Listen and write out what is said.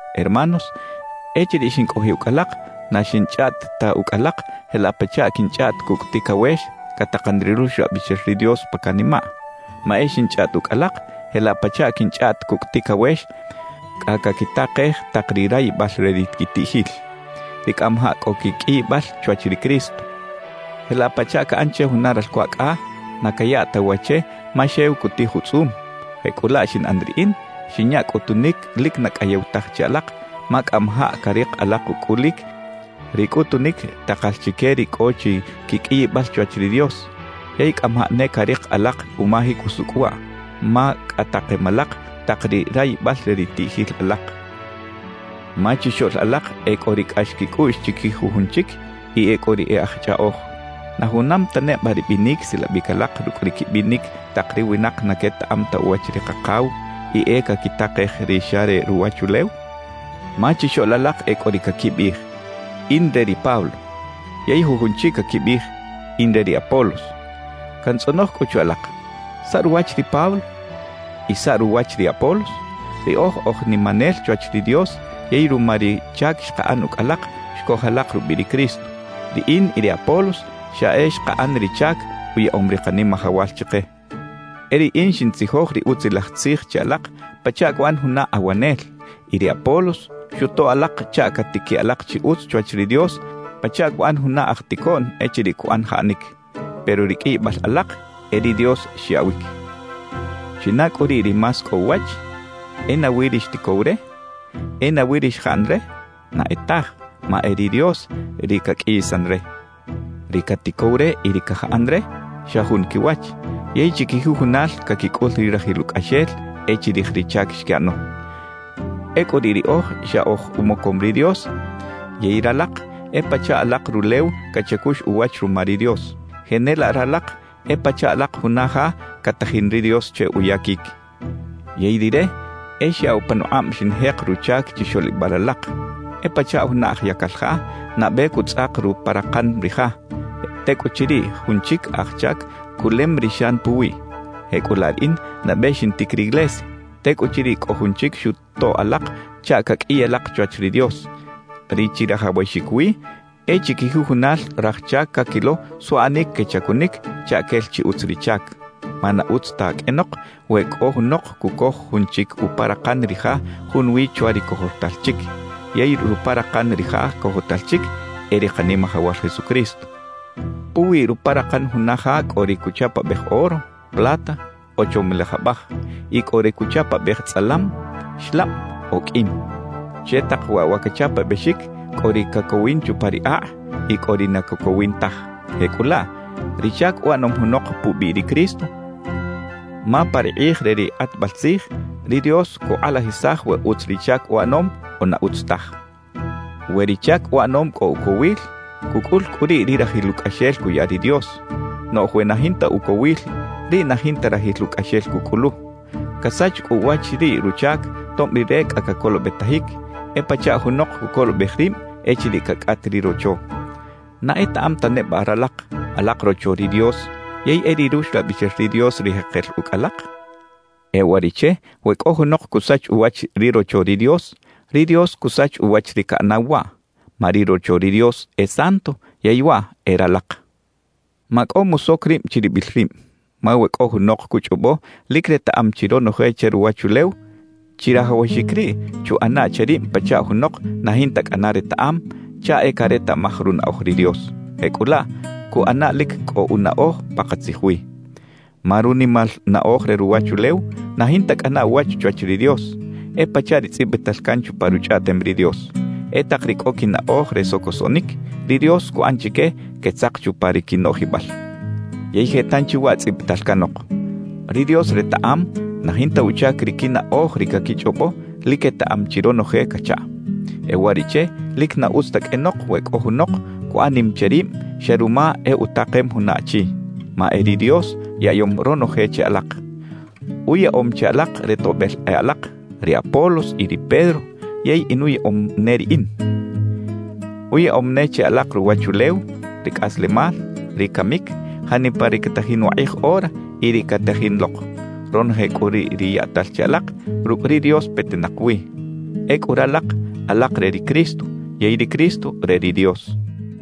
Hermanos, echiriꞌ xincꞌojiꞌ ucꞌ alak, na xinchꞌaꞌt ta ucꞌ alak jelaꞌ pachaꞌ quinchꞌaꞌt cucꞌ ticawex catakan ri Ruxlabixel ri Dios pa canimaꞌ; ma e xinchꞌaꞌt ucꞌ alak jelaꞌ pachaꞌ quinchꞌaꞌt cucꞌ ticawex cꞌa caquitakej tak ri rayibal re ri quitiꞌjil, ri cꞌamajaꞌ cꞌo quiqꞌuiyibal chwach ri Cristo. Jelaꞌ pachaꞌ caꞌan che juna ralco acꞌa, na cayaꞌ ta wa che ma xew cutij utzꞌum; jecꞌulaꞌ xinꞌan riꞌin, xinya cꞌutunic lic na cꞌayew taj che alak, ma cꞌamajaꞌ carik alak ucꞌulic ri cꞌutunic takal chique ri cꞌo chi quiqꞌuiyibal chwach ri Dios. Yey cꞌamajaꞌ ne carik alak umajic usucꞌ waꞌ, ma cꞌa takem alak tak ri rayibal re ri tiꞌjil alak. Ma chixoꞌl alak e cꞌo ri cꞌax quicꞌuꞌx chiquij jujun chic y e cꞌo ri e aj chꞌaꞌoj. ¿Na junam ta neba ri binic silabic alak rucꞌ ri quibinic tak ri winak na quetaꞌam ta uwach ri Kakaw y e caquitakej ri xa re ruwachulew? Ma chixoꞌl alak e cꞌo ri caquibiꞌij: «In re ri Pablo» yey jujun chic caquibiꞌij: «In re ri Apolos.» Cantzꞌonoj cꞌu che alak: ¿Saꞌ ruwach ri Pablo? ¿Y saꞌ ruwach ri Apolos? Riꞌoj oj nimanel chwach ri Dios yey ruma ri chac xkaꞌan ucꞌ alak, xcoj alak rubiꞌ ri Cristo. Riꞌin y ri Apolos xa e xkaꞌan ri chac uyaꞌom ri Kanimajawal chike. E riꞌin xintzijoj ri Utzilaj Tzij che alak pachaꞌ cuꞌan juna awanel; y ri Apolos xutoꞌ alak chaꞌ catiquiꞌ alak chi utz chwach ri Dios pachaꞌ cuꞌan juna aj ticoꞌn echiriꞌ cuꞌan jaꞌanic. Pero ri qꞌuiyibal alak, e ri Dios xyaꞌwic. ¿China cꞌu riꞌ ri más cꞌo uwach? ¿E nawi ri xticow re? ¿E nawi ri xjaꞌan re? Na e taj, ma e ri Dios, ri caqꞌuiyisan re. Ri caticow re y ri cajaꞌan re, xa jun quiwach; yey chiquijujunal caquicꞌul ri rajil ucꞌaxel e chirij ri chac xquiꞌano. Ecꞌu riꞌ riꞌoj xa oj umocom ri Dios yey ralak e pachaꞌ alak rulew cachacux uwach ruma ri Dios. Jenelaꞌ ralak e pachaꞌ alak juna ja catajin ri Dios che uyaquic. Yey Rire e xyaꞌw panukꞌab xinjek ruchac chixoꞌlibal alak. E pachaꞌ juna aj yacal ja, nabe cutzꞌak ruparakan ri ja; tecꞌuchiriꞌ jun chic aj chac culem ri xan puwiꞌ. Jecꞌulaꞌ riꞌin nabe xintic riglesia; tecꞌuchiriꞌ cꞌo jun chic xutoꞌ alak chaꞌ caqꞌuiy alak chwach ri Dios. Ri chirajawaxic wi e chiquijujunal raj chac caquilo suꞌanic quechacunic chaꞌ quel chi utz ri chac. Ma na utz ta qꞌuenok we cꞌo junok cucoj jun chic uparakan ri ja junwi chwa ri cojotal chic; yey ruparakan ri ja cojotal chic, e ri Kanimajawal Jesucristo. Puwi ruparakan juna ja cꞌo ri cuchapabej oro, plata o chomilaj abaj; y cꞌo ri cuchapabej tzꞌalam, xlab o qꞌuim. Che tak waꞌ wa cachapabexic cꞌo ri cacowin chupa ri akꞌ y cꞌo ri na cacowin taj; jecꞌulaꞌ ri chac uꞌanom junok pubiꞌ ri Cristo, ma pa ri kꞌij re ri kꞌatbal tzij, ri Dios cukꞌalajisaj we utz ri chac uꞌanom o na utz taj. We ri chac uꞌanom cꞌo ucowil, cucꞌul cꞌu riꞌ ri rajil ucꞌaxel cuya ri Dios; noꞌj we na jinta ucowil, riꞌ na jinta rajil ucꞌaxel cucꞌulu. Casach cꞌu uwach riꞌ ruchac, tob rire cꞌa cacolobetajic, e pachaꞌ junok cucolobej rib echiriꞌ cacꞌat ri rocho. ¿Na etaꞌam ta neba ralak, alak rocho ri Dios yey e ri Ruxlabixel ri Dios ri jekel ucꞌ alak? E uwariꞌche we cꞌo junok cusach uwach ri rocho ri Dios, ri Dios cusach uwach ri caꞌanaw waꞌ. Ma ri rocho ri Dios e santo; yey waꞌ e ralak. Macꞌo musoc rib chiribil rib. Ma we cꞌo junok cuchꞌobo lic retaꞌam chi ronoje che ruwachulew, chirajawaxic riꞌ chuꞌana che rib pachaꞌ junok na jinta cꞌana retaꞌam, chaꞌ e caretaꞌmaj runaꞌoj ri Dios. Jecꞌulaꞌ cuꞌana lic cꞌo unaꞌoj pakatzij wi. Ma runimal naꞌoj re ruwachulew na jinta cꞌana uwach chwach ri Dios. E pachaꞌ ri tzꞌibital can chupa Ruchꞌaꞌtem ri Dios: E tak ri cꞌo quinaꞌoj re socosoꞌnic, ri Dios cuꞌan chique quetzak chupa ri quinoꞌjibal. Yey je tanchi waꞌ tzꞌibital canok: Ri Dios retaꞌam na jinta uchac ri quinaꞌoj ri caquichꞌobo lic quetaꞌam chi ronoje cachaꞌ. E uwariꞌche lic na utz ta qꞌuenok we cꞌo junok cuꞌan nim che rib xa ruma e utakem juna achi. Ma e ri Dios yaꞌyom ronoje che alak. Uyaꞌom che alak re toꞌbel e alak, ri Apolos y ri Pedro yey inuyaꞌom ne riꞌin. Uyaꞌom ne che alak ruwachulew, ri cꞌaslemal, ri camic, janipa ri catajin wakꞌij ora y ri catajin lok. Ronoje cꞌu riꞌ ri yaꞌtal che alak, rucꞌ ri Dios petinak wi. Ecꞌu ralak, alak re ri Cristo; yey ri Cristo, re ri Dios.